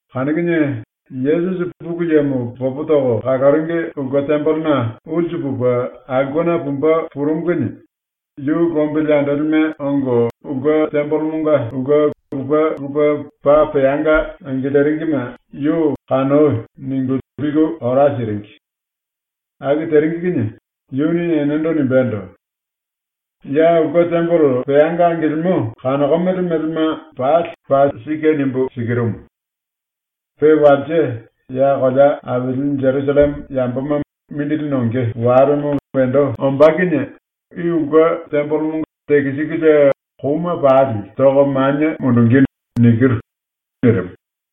Kanu kinie Yesusi ⸤Pulu Yemo popo toko kaloringi⸥ ulke tembelena ulsu pupe aulkena pumbe purumu kinie yu lombili andolime ongo ulke tembelemonga ulke lupe lupe ⸤paa peanga angiliringime⸥ yu “Kanoi.” ningu liku ora siringi. ⸤Aku teringi kinie⸥ yuni enendo nimbendo: “Ya ⸤ulke tembele peanga angilimo⸥ kanokomele melema pali paa sike nimbu sikirumu: ⸤Pe walse ya kolea aili Jerusalleme yamboma mindili nonge walemo wendo ombá kinie⸥ i ulke tembelemo tekisikulie kouma pali toko manie mundungí.” nirimu.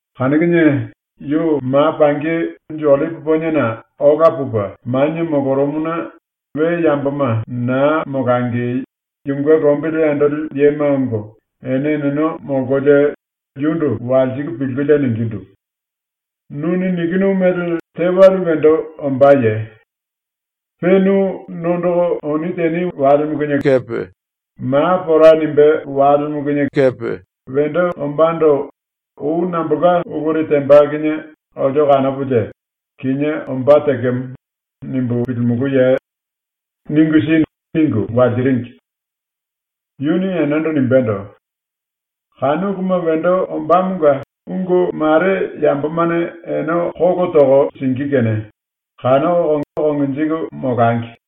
Kanu kinie yu ma pangi Unju Ollipi Poniena ola pupe manie molorumuna we yamboma na molangi yunge lombili andoli yema ongo ene eneno molkolie yundu walsiku pilkulie ningindu: “Nuni nikinu mele tewale wendo ombáye? Pe nu nondoko oni teni walemo kinie kepe ma pora nimbé walemo kinie kepe wendo ombándo ou nambolka uluri temba kinie olio kanopolie “Kinié ombá tekemo.” nimbu pilimulúye? Ningu si.” ningu walsiringi. Yuni enendo nimbendo: “⸤Kanu uluma wendo ombámonga ungu mare⸥ yambomane ene kolo toko singí kene kanoko konjiku molangi.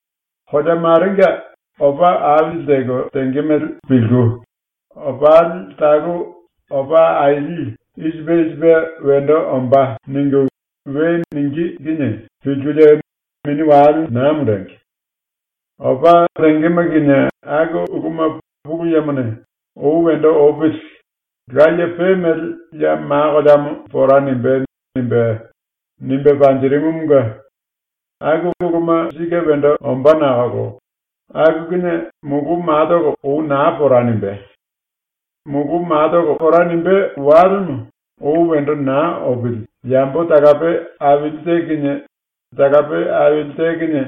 “Kolea marenga opa aili teko tenge mele pilku, ‘Opali talu opa aili i sipe i sipe wendo ombá.’ ningu we ningí kinie pilkulie mini wale na mundengi. Opa tengema kinie aku uluma Pulu Yemone ‘Ou wendo opili. Laye pe mele ya ma koleamo pora nimbé.’ nimbe, nimbe panjirimumunge aku uluma sike wendo ombá nakolo aku kinie mulu matolo ou na pora nimbé. ⸤Mulu ma pora nimbé walemo ou wendo na opili⸥ yambo talape aili te kinie talape aili te kinie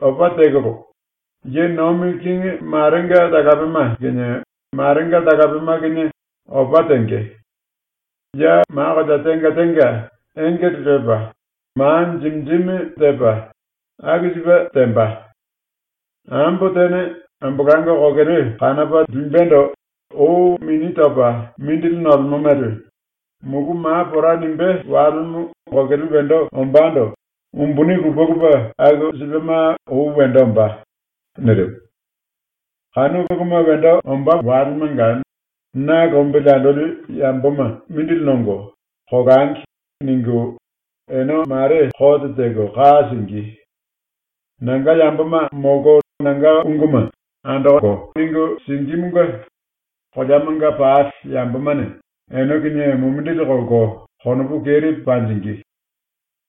opa tekolo, ye nomi kingi marenga talapema kinie marenga talapema kinie opa tenge. Ya ma kolea tenga tenga engele lepa, ma jimi jimi tepa, aku sipe temba. Ambo tene ambolango kokele kanopa limbendo ou mini topa mindili nolemo mele, mulu ma pora nimbé walemo kokele wendo ombándo umbuni lupe lupe aku sipema ou wendo ombá.” ⸤nirimu⸥. “Kanu uluma wendo ombá walemanga ‘⸤Na lombili andoli yamboma⸥ mindili nongo, kolangi.’ ningu ⸤ene mare⸥ kote teko ka singí. Nanga yamboma molko nanga unguma andoko ningu singímunge koleamanga pali yambomane ene kinie mumindili kolko konopu keri panjingí.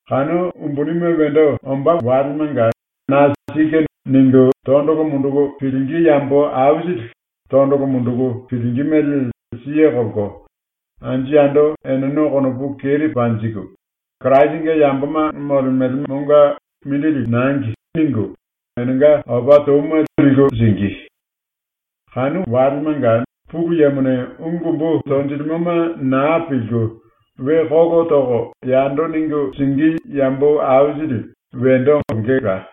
⸤Kanu umbunime wendo ombá⸥ walemanga na ‘Sike.’ ningu tondolo munduku pilingí yambo aisili tondolo munduku pilingí mele siye kolko anju yando eneno konopu keri panjiku, ‘Kirasinge yamboma molemelemonga mindili nangi.’ ningu enenga opa touma liku singí. ⸤Kanu walemanga⸥ Pulu Yemone ungu umbu tonjilimoma na pilku we kolo toko yando ningu singí yambo aisili wendo ongela.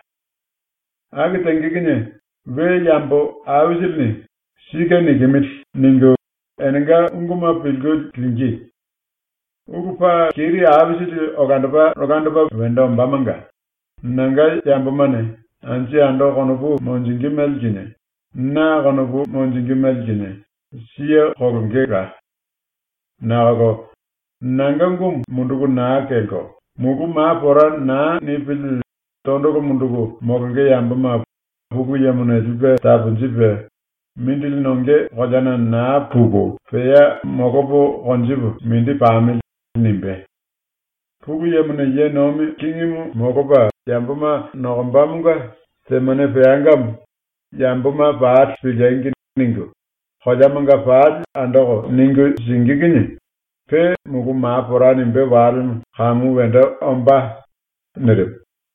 Aku tenge kinie we yambo aisilini ‘Sike nikimili.’ ningu enenga unguma pilku lingí. Ulu paa keri aisili olandopa olandopa wendo ombámonga nanga yambomane ⸤anju yando⸥ konopu monjingí mele ⸤kinie, na konopu monjingí mele kinie⸥ siye kolongela. Nakolo nanga ungumu munduku na kelko mulu ma pora na nipili tondolo munduku molonge yamboma ⸤Pulu Yemone⸥ lipe taponjipe ‘Mindili nonge koleana na puku pea molopo konjipu mindi pamili.’ nimbé. Pulu Yemone ye nomi kingimu molopa yamboma nokombamonga temane peangamo ‘Yamboma pali piliengi!’ ningu koleamanga pali andoko ningu singí kinie pe mulu ma pora nimbé walemo kamu wendo ombá.” ⸤nirimu.⸥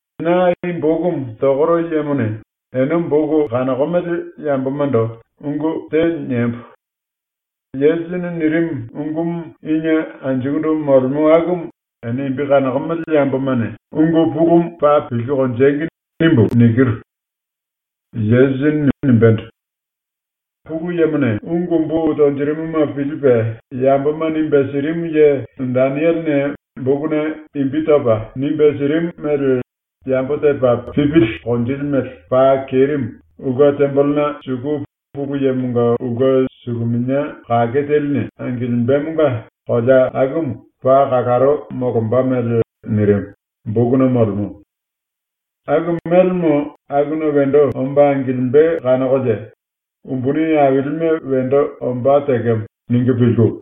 (⸤Na i bokumu tokoro yemone ene boku kanokomele yambomando ungu te niembo:⸥ ‘⸤Yesusini nirimu⸥ ungumu inie anjukundu molemo akumu ene imbi kanokomele yambomane ungu pulumu paa pilku konjengi.’ nimbu nikiru: ⸤Yesusini nimbendo:⸥) “Pulu Yemone ungu umbu tonjirimuma pilipe yamboma nimbe sirimu ye Denielene bokuna imbi topa nimbe sirimu mele yambo tepa pipili konjili mele paa kerimu ⸤ulke tembelena suku⸥ Pulu Yemonga ulke suluminia kake teline angilimbemonga kolea akumu paa kalaro molomba mele nirimu, bokuna molemo. Aku mélemo akuna wendo omba angilimbe kanokolie ⸤‘Umbuni ailime wendo ombá tekemo.’ ningu pilku⸥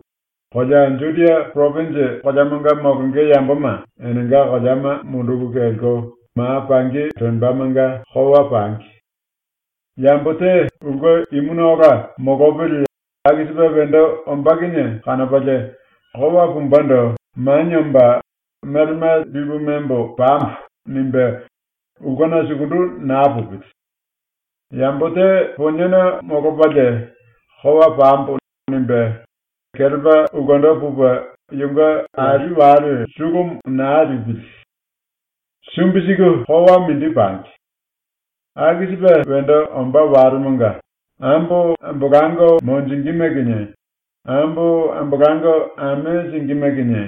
kolea Judia poropinji koleamanga molonge yamboma ⸤enenga koleama munduku kelko⸥ ma pangi lembamanga kowa pangi. Yambo te ulke imuna ola molopili ⸤aku sipe wendo ombá kinie kanopalie⸥ kowa pumbendo manie omba ‘Melema lipu membo pambo.’ nimbe ulkena sukundu na pupili. Yambo te poniena molopalie ⸤‘Kowa pambo.’ nimbe⸥ kelepa ulkendo pupe yunge ali wale sulumu na lipili. ⸤Sumbi siku kowa mindi pangi.⸥ Aku sipe wendo ombá walemonga ambo ambolango monjingíme kinie, ambo ambolango ame singíme kinie,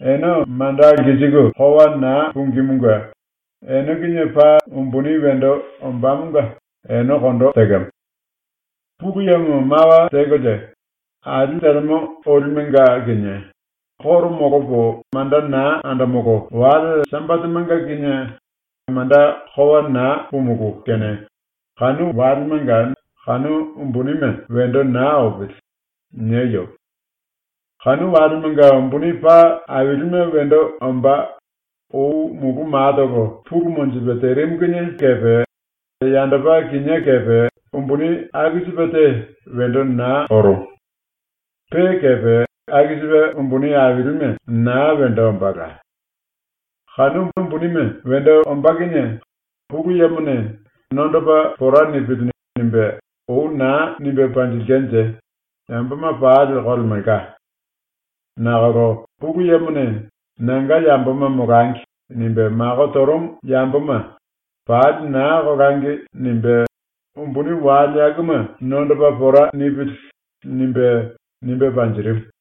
⸤ene manda lkisiku kowa na pungímunge⸥ ene kinie paa umbuni wendo ombámonga ene kondo tekemo. “Pulu Yemo mawa tekolie, ‘Ali telemo olimenga kinie ⸤koro molopo manda na andomolo⸥ wale Sambatemanga kinie manda kowa na pumulú kene kanu walemanga kanu umbunime wendo na opili.’ nieyo. Kanu walemanga umbuni paa ailime wendo ombá, ou mulu matolo pulu monjipe terimu kinie kepe, yandopa kinié kepe umbuni aku sipe te wendo na orumu. Pe kepe aku sipe umbuni ailime na wendo ombála. ⸤Kanu umbunime wendo ombá kinie Pulu Yemone⸥ ‘Nondopa pora nipili.’ nimbe ou na nimbe panjilkenje yamboma pali kolemelka. Nakolo Pulu Yemone ‘Nanga yamboma molangi.’ nimbe mako torumu yamboma ‘Pali na kolangi.’ nimbe ‘Umbuni wale akuma nondopa pora nipili.’ nimbe, nimbe panjirimu.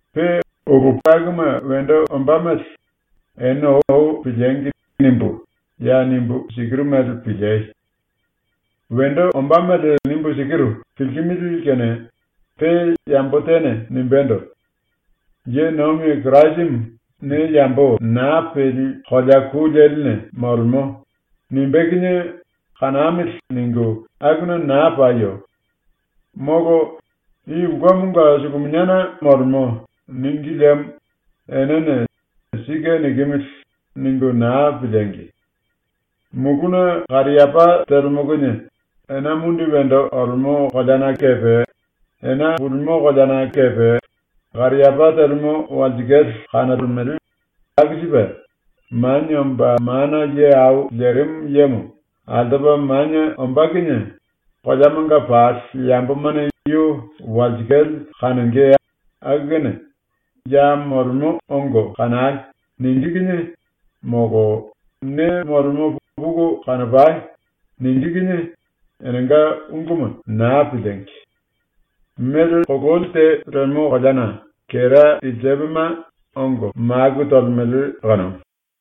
Pe ulu akuma wendo ombá mele ‘Ene ou piliengi!’ nimbu ya nimbu sikiru mele piliei. “⸤Wendo ombá mele nimbu sikiru, pilkimili⸥ kene pe yambo tene nimbendo: “⸤Ye nomi Kirasimu⸥ ne yambo na peli kolea ku leline molemo.” nimbé kinie ‘Kanamili.’ ningu akuna na payo. Molo “I ulkemonga suluminiana molemo.” níngi liemo enene ‘Sike nikimili.’ ningu na piliengi! Muluna kariapá telemo kinie ena mundi wendo olemo koleana kepe ena pulimo koleana kepe kariapá telemo walsikale kanolemele, aku sipe Manie Omba Mana Ye Au Lerimu Yemo ⸤altopa⸥ manie ombá kinie koleamanga pali yambomane yu walsikale kanonge aku kene “Ya molemo ongo kanai.” ningí kinie, molo “Ne molemo puku kanopai.” ningí kinie, enenga unguma na piliengi! Mele kololi te lemo koleana kera ilsepema ongo maku tolemele kanumu.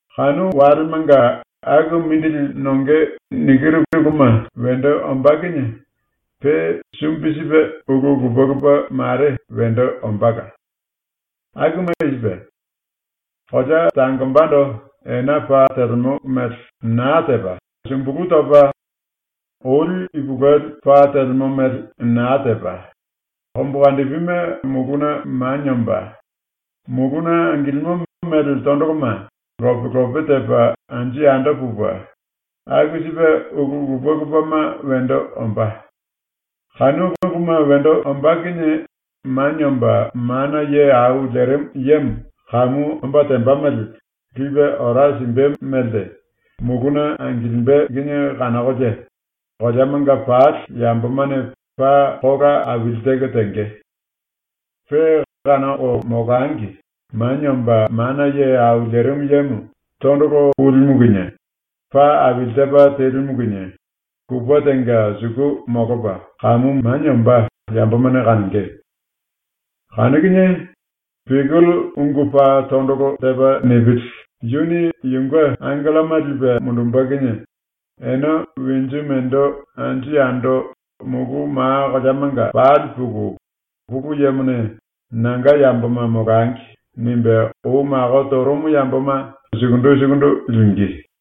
“Kanu walemanga aku mindili nonge nikiru uluma wendo ombá kinie pe sumbi sipe ⸤ulu lupe lupe mare wendo ombála. Akuma i sipe:⸥ ‘Kolea tangombando ena pa telemo mele na tepa, sumbulu topa, oli ipulueli pa telemo mele na tepa, kombukandipime muluna manie omba, muluna angilimo mele tondoloma lope lope tepa anju yando pupe, aku sipe ulu lupe lupema wendo ombá.’ Kanu uluma wendo ombá kinie Manie Omba Mana Ye Au Lerimu Yemo kamu ombá temba mele lipe ora simbe melte muluna angilimbe kinie ⸤kanokolie⸥ koleamanga pali yambomane paa kola aili teko tenge. Pe kanoko molangi Manie Omba Mana Ye Au Lerimu Yemo tondolo pulimu kinie, pa aili tepa telimu kinie kupe tenga suku molopa kamu manie ombá yambomane kanonge. Kanu kinie biyukele ungu paa tondolo tepa nipili yuni yunge angelloma lipe mundumbe kinie ene winju mendo anju yando mulu ⸤ma koleamanga⸥ pali puku Pulu Yemone ‘Nanga yamboma molangi.’ nimbe ou mako torumu yamboma sukundu sukundu lingí.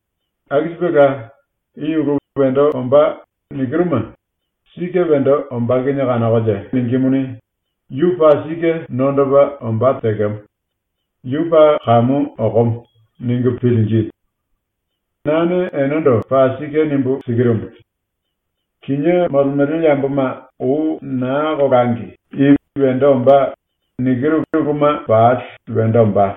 Aku sipela, i ulu “Wendo ombá.” nikiruma sike wendo ombá kinie kanokolie ningímuni ‘Yu paa sike nondopa ombá tekemo. Yu paa kamu okomo.’ ningu pilingí. Nane enendo paa sike nimbu sikirumu: Kinié molemele yamboma ou na kolangi i “Wendo ombá.” nikiru uluma pali wendo ombá.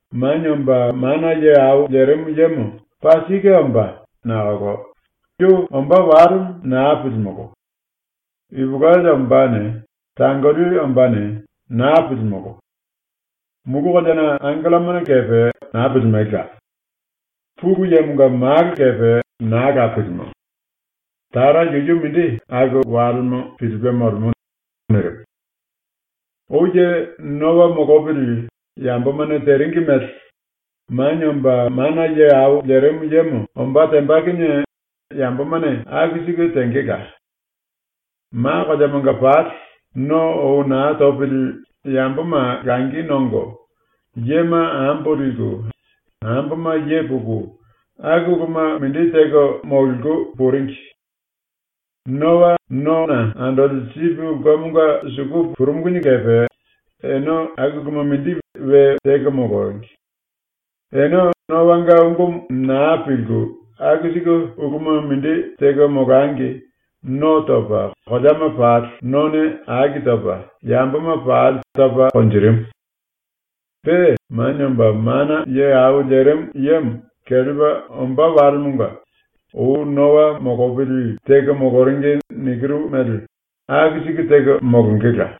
“⸤Manie Omba Mana Ye Au Lerimu Yemo paa sike ombá⸥ nakolo yu ombá walemo na pilimolo. Ipulueli ombáne, tangoli ombáne na pilimolo. Mulu koleana angelloma kepe na pilimelela. Pulu Yemonga Malo kepe naa la pilimo. Tara yuyu mindi ⸤aku walemo⸥ pilipe molemo.” ⸤nirimu.⸥ “Ou ye Noa molopili yambomane teringi mele Manie Omba Mana Ye Au Lerimu Yemo ombá temba kinie yambomane aku siku tengela. ⸤Ma koleamanga pali⸥ no ou na topili yamboma langi nongo, yema ambo liku, amboma ye puku, aku uluma mindi teko mololiku puringi. Noa nona andoli sipi ulkemonga suku purumu kinie kepe ene aku uluma mindi we teko moloringi. Ene ⸤Noanga ungumu⸥ na pilku aku siku uluma mindi teko molangi no topa ⸤koleama pali none aki topa⸥ yamboma pali topa konjirimu. Pe Manie Omba Mana Ye Au Lerimu Yemo kelepa ombá walemonga ou Noa molopili teko moloringi nikiru mele aku siku teko molongela.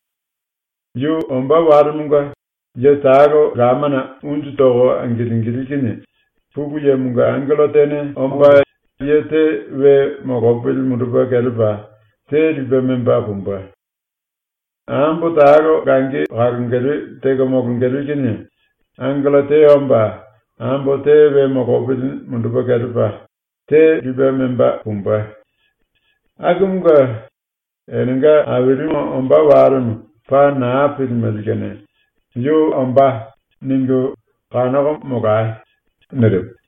Yu ombá walemonga ye talo lamana unju toko angilingilí kinie ⸤Pulu Yemonga angello tene omba⸥ ye te we molopili mundupe kelepa te lipe memba pumbe. Ambo talo langi kalongele teko molongele kinie ⸤angello te omba⸥ ambo te we molopili mundupe kelepa te lipe memba pumbe. “Akumunge enenga Ailimu ombá walemo paa na pilimele kene ‘Yu ombá.’ ningu kanoko molai.” ⸤nirimu⸥.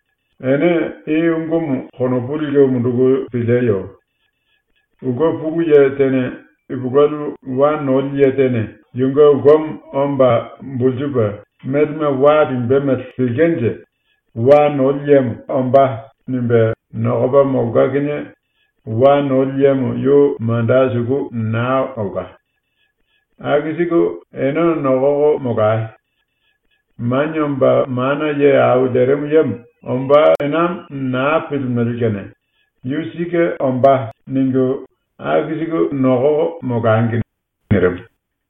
“Ene i ungumu konopu liku munduku pilieyo: Ulke pulu ye tene ipulueli wa noli ye tene yunge ulkemo omba bulsupe melema wa limbe mele pilkenje ‘Wa noli yemo ombá.’ nimbe nokopa molka kinie wa noli yemo yu manda suku na olka. Aku siku ene nokoko molai. Manie Omba Mana Ye Au Lerimu Yemo ombá enamo na pilimele kene ‘Yu sike ombá.’ ningu aku siku nokoko molangi.” ⸤nirimu.⸥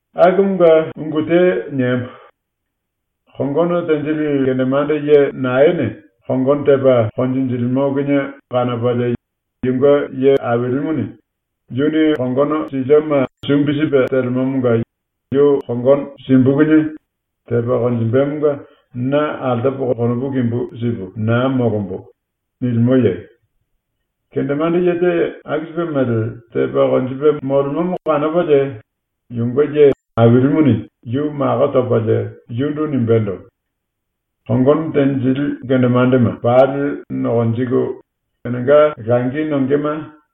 “⸤Akumunge ungu te niembo:⸥ Kongono tenjili kendemande ye naene kongono tepa konjinjilimo kinie kanopalie yunge ye ailimuni ‘Yuni kongono silioma sumbi sipe telemomonga yu kongono simbu kinie tepa konjimbemonga na altopo konopu kimbu sipu na molombo.’ nilimoye? Kendemande ye te aku sipe mele tepa konjipe molemomo kanopalie yunge ye ailimuni yu mako topalie yundu nimbendo: “Kongono tenjili kendemandema pali nokonjiku enenga langi nongema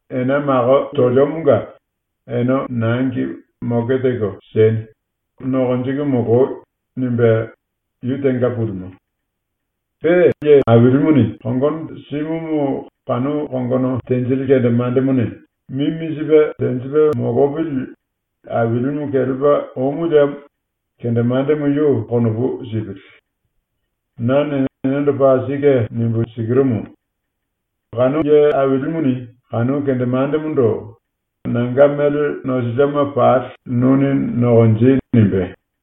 ena mako toliomonga ene nangi moke teko sieni, nokonjiku moloi.” nimbe ⸤yu tenga pulimo⸥. Pe ye ailimuni kongono simumu kanu kongono tenjili kendemandemone mimi sipe tenjipe molopili ailimu kelepa omu liemo kendemandemo yu konopu sipili. Nane enendo paa sike nimbu sikirumu: Kanu ye ailimuni kanu kendemandemondo “Nanga mele nosilioma pali nuni nokonji.” nimbé.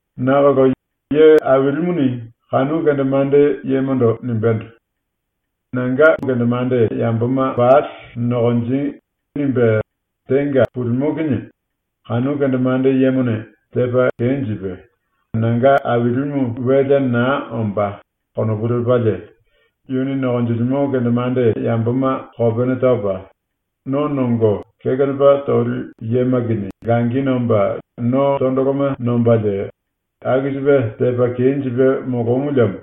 Nakolo ⸤ye ailimuni kanu kendemande yemondo nimbendo: “Nanga kendemande yamboma pali nokonji.” nimbe tenga pulimo kinie⸥ kanu kendemande yemone tepa kenjipe “Nanga ailimu welea na ombá.” konopu lepalie yuni nokonjilimo kendemande yamboma kopene topa, no nongo kekelepa toli yema kinie langi nomba no tondoloma nombalie, aku sipe tepa kenjipe molomu liemo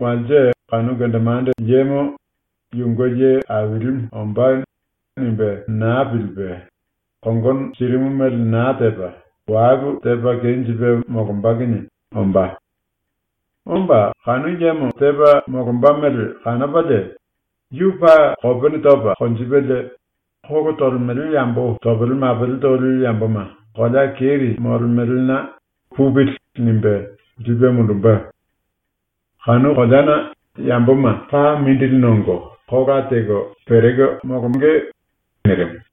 walse kanu kendemande yemo ‘Yunge ye ailimu ombá.’ nimbe na pilipe ⸤kongono sirimu mele na tepa⸥ walu tepa kenjipe molomba kinie ombá. Omba ⸤kanu yemo tepa molomba mele kanopalie⸥ yu paa kopene topa konjipelie, kolo tolemele yambo topele mapele toli yamboma ⸤kolea keri⸥ molemelena ‘Pupili.’ nimbe lipe mundumbe. Kanu koleana yamboma paa mindili nongo kola teko pereko molonge.” ⸤nirimu.⸥